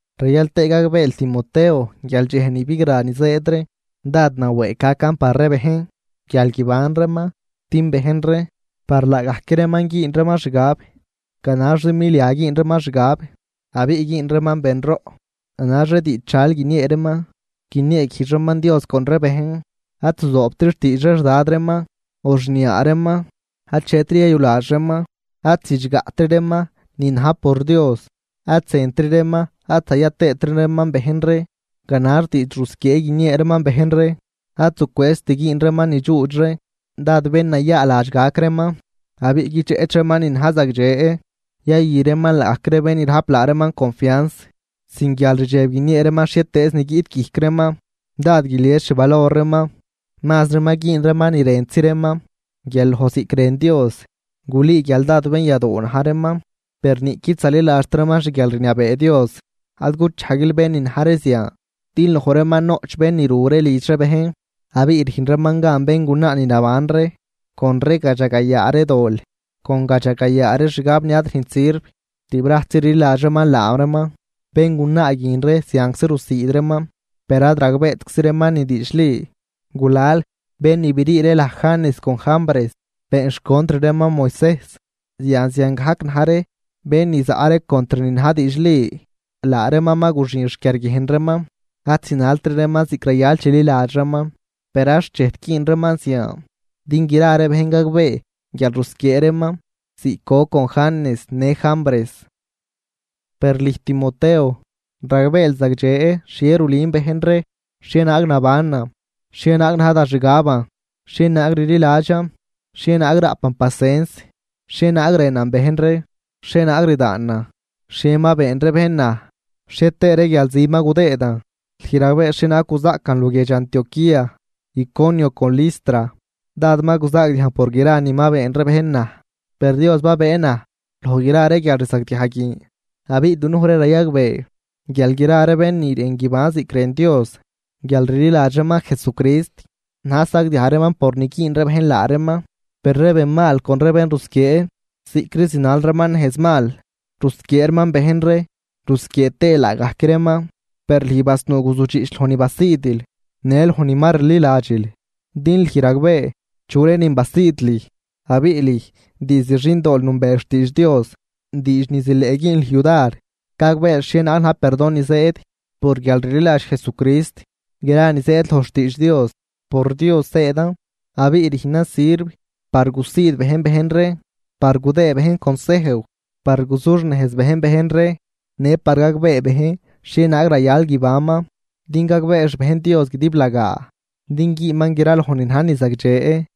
Rayal tëë gagbeel Timoteo guial dxej ni bigra ni zëëd ree, dád nawëëg gacan par ree bejn guial guiban reeman. Din bejn ree, par laagajc reeman güün reeman xgab, ganaxzi milia güün reeman xgab, abiꞌ güün reeman benroꞌ, ganax ree diidxdxal guiniee reeman, guinieeguijdx reeman Dios con ree bejn. Ad zuzoobtri xtiidx ree xdad reeman o xniaa reeman, achetri yayuladx reeman, ad zidxgaꞌtri reeman ni na̱j por Dios, ad zëntri reeman ad zaya tëëtri reeman bejn ree. Ganax diidx rusquiee guiniee reeman bejn ree, ad zucwëëzt güün reeman ni dxuudx ree, dád bén nayaaladx gac reeman, abiꞌ guidxeꞌch reeman ni na̱j zagdxe. Yayü reeman laagajc ree bén ni rajp laa reeman confians, sin guialrdxeb guiniee reeman xhietëëz ni guiꞌt guijc reeman, dád guilies xvalor reeman, mazri ma güün reeman ni rëntzi reeman guial loj ziꞌc rën Dios. Gulüü guial dád benyadoo na̱j reeman, per niꞌquid zaliladxt reeman xguialrniabee Dios. Ad guchajguil bén ni na̱j ree zian. Din loj reeman noꞌch bén ni ru ree lidx ree bejn, abiꞌ rüjn reeman gan béngunaa ni naban ree con gadxagayaa ree dol, con gadxagayaa ree xgab ni ad rüjnt sirv, tibrajtzi rliladx reeman laa reeman béngunaa guin ree zianczi rusiid reeman, per ad ragbeetczi reeman ni diidxli. Gulal bén ni brii ree laj Janes con Jambres been xcontr reeman Moisejs. Yan ziangajc na̱j ree bén ni zaꞌ ree contr ni na̱j diidxli, laa reeman ma guxin xquiarguiejn reeman, ad zinaltri reeman ziꞌc rayal chililadx reeman. Per ad xchejt güün reeman zian, din gra ree bejn gagbee guial rusquiee reeman ziꞌc goc con Janes në Jambres. Per lüj Timoteo, ragbeel zagdxe xhie rulün bejn ree, xhienaag nabanan, xhienaag na̱j da xgaban, xhienaag rliladxan, xhienaag raꞌpan pacens, xhienaag rënan bejn ree, xhienaag rdaanan, xhie ma been ree bejn naj, xhie tëë ree guialzi ma gudëëdan. Lüj ragbee xhienaag guzaꞌcan luguiedx Antioquía, Iconio con Listra. Dád ma guzaagdiajn por gra ni ma been ree bejn naj, per Dios babëë naj loj gra ree guialrzagdiaj guin. Abiꞌ dunuj ree rayagbee guial gra ree bén ni rën guiban ziꞌc rën Dios guialrliladx reeman Jesucrist, na̱j sagdiaj reeman por ni güün ree bejn laa reeman. Per ree ben mal con ree bén rusquiee, ziꞌcri zinal reeman nejz mal, rusquiee reeman bejn ree rusquiee tëë laagajc reeman. Per lüj basnuu guzudxiꞌch loj ni ma basiidil, në loj ni ma rliladxil, din lüj ragbee chu ree nin basiid lüj. Abiꞌ lüj diizd xindool nünbeel xtiidx Dios, diidx ni zileꞌ güün lüj yudar gagbeel xhienaag na̱j perdon ni zëëd por guialrliladx Jesucrist. Gra ni zëëd loj xtiidx Dios, por Dios zëëdan. Abiꞌ rüjnan sirv par gusiid bejn bejn ree, par gudëë bejn consejw, par guzuxnejz bejn bejn ree, në par gagbee bejn xhienaag rayal guibanman, din gagbee xbejn Dios guidiblagaa din güünman graloj ni na̱j ni zagdxe.